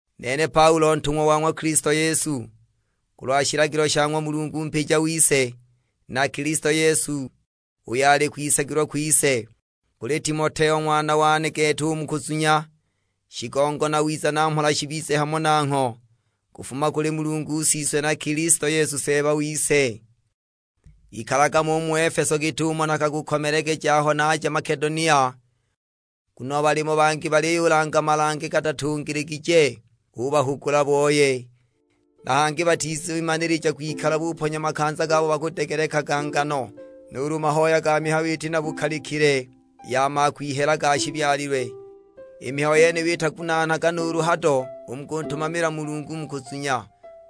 Nene Paulo ntung'wa wa ng'wa Kilisto Yesu, kulwa shilagilo sha ng'wa Mulungu mpija wise, na Kilisto Yesu uyo ali kwisagilwa kwise. Kuli Timoteo ng'wana wane gete u mu kuzunya; shigongo na wiza na mhola shibize hamo nangho, kufuma kuli Mulungu Siswe na Kilisto Yesu Seeba wise. Ikalaga mo u mu Efeso git'umo nakakukomelegeja aho najaga Makedonia, nguno balimo bangi baliyulanga malange gatatungiligije; ubahugula booye. Na hangi batizimanilija kwikala buponya makanza gabo bakudegelekaga ngano, nuulu mahoya ga mihayo iti na bukalikile ya makwihela ga shibyalilwe. I mihayo yeniyo itagunaanaga nuulu hado u mu kuntumamila Mulungu mu kuzunya,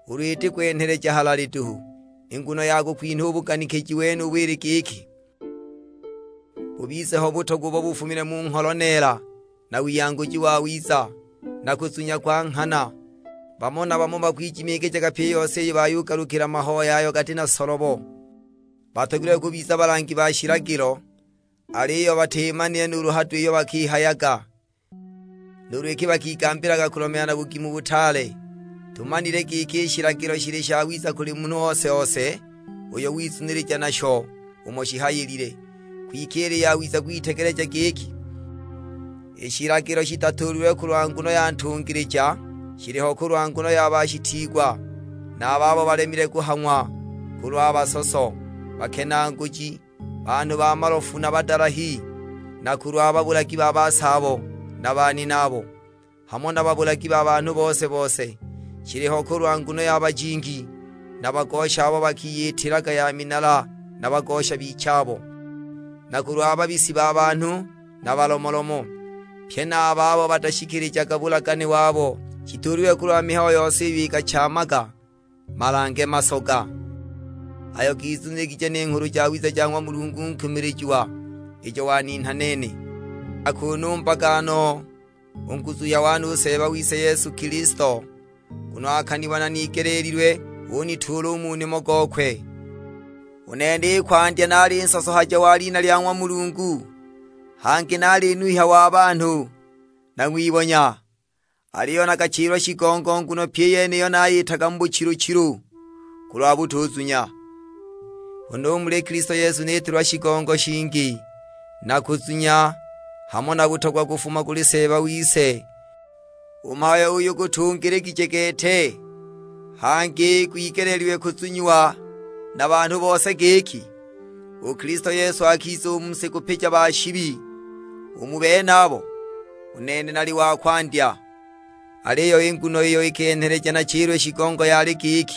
ulu iti kwenheleja halali duhu. I nguno ya kukwinha u buganikiji wenubu ili giki, bubize ho butogwa ubo bufumile mu ngholo neela na wiyanguji wawiza, na kuzunya kwa nghana. Bamo na bamo bakwijimiijaga pyi i yose iyi bayugalukila mahoya ayo gati na solobo! Batogilwe kubiza balangi ba shilagilo, aliyo batimanile nuulu hado iyo bakihayaga, nuulu iki bakigambilaga kulomeela na bugimu butaale. Tumanile giki i shilagilo shili shawiza kuli munhu ose-ose uyo wizunilija nasho umo shihayilile. Kwike ili yawiza kwitegeleja giki, i shilagilo shitatuulilwe kulwa nguno ya ntungilija, shiliho kulwa nguno ya bashitiigwa na a babo balemile kuhang'wa; kulwa basoso, bakenaaguji, banhu ba malofu na badalahi; na kulwa babulagi ba basaabo na baninaabo, hamo na babulagi ba banhu bose-bose! Shiliho kulwa nguno ya bajingi, na bagosha abo bakiyitilaga ya minala na bagosha bichabo; na kulwa babisi ba banhu na balomolomo, pye na a babo batashikilijaga bulagane wabo. Shituulilwe kulwa mihayo yose iyo ikachaamaga malange masoga, ayo gizuniligije ni Nghulu Jawiza ja ng'wa Mulungu nkumilijiwa; ijo waninha nene. Nakunumbaga no u nguzuhya wane u Seeba wise Yesu Kilisto; nguno akanibona nigeleelilwe, unituula u mu nimo gokwe. U nene i kwandya naali nsosohaja wa lina lya ng'wa Mulungu, hangi naali nuhya wa banhu, na ng'wibonya! Aliyo nakachilwa shigongo nguno pyi i yeniyo nayitaga mu buchilu-chilu, kulwa butuzunya. Huna u muli Kilisto Yesu nitiilwa shigongo shingi, na kuzunya, hamo na butogwa kufuma kuli Seeba wise. U mhayo uyu gutungiligije gete, hangi gwigeleelilwe kuzunyiwa na banhu bose; giki: U Kilisto Yesu akiza u mu si kupija ba shibi. U mu benabo, u nene nali wa kwandya! Aliyo i nguno iyo ikenheleja nachilwe shigongo yali giki,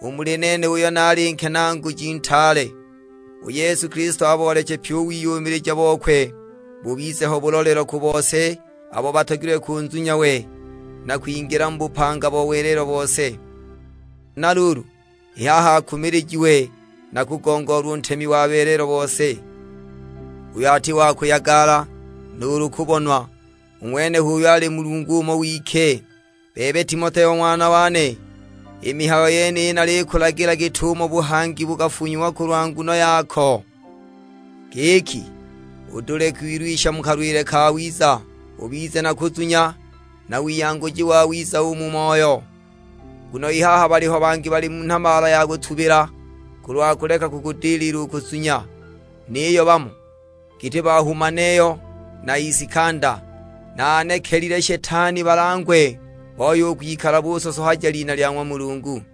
u muli nene uyo naali nkenaaguji ntaale, u Yesu Kilisto abooleche pyi u wiyumilija bokwe. Bubize ho bulolelo ku bose abo batogilwe kunzunya we, na kwingila mu bupanga bo welelo bose. Huna luulu, i haha akumilijiwe na kugongoolwa u Ntemi wa welelo bose, uyo ati wa kuyagala, nuulu kubonwa, u ng'wene h'uyo ali Mulungu umo wike. Bebe Timoteo ng'wana wane, i mihayo yeniyi nalikulagila git'umo buhangi bukafunyiwa kulwa nguno yako, giki udule kwilwisha mu kalwile kawiza. Ubize na kuzunya, na wiyanguji wawiza u mu moyo; nguno i haha baliho bangi bali mu nhabaala ya kutubila, kulwa kuleka kukudilila u kuzunya. Niyo bamo, giti ba Humaneyo na Isikanda, naanekelile Shetani balangwe, booye u kwikala busosohaja lina lya ng'wa Mulungu.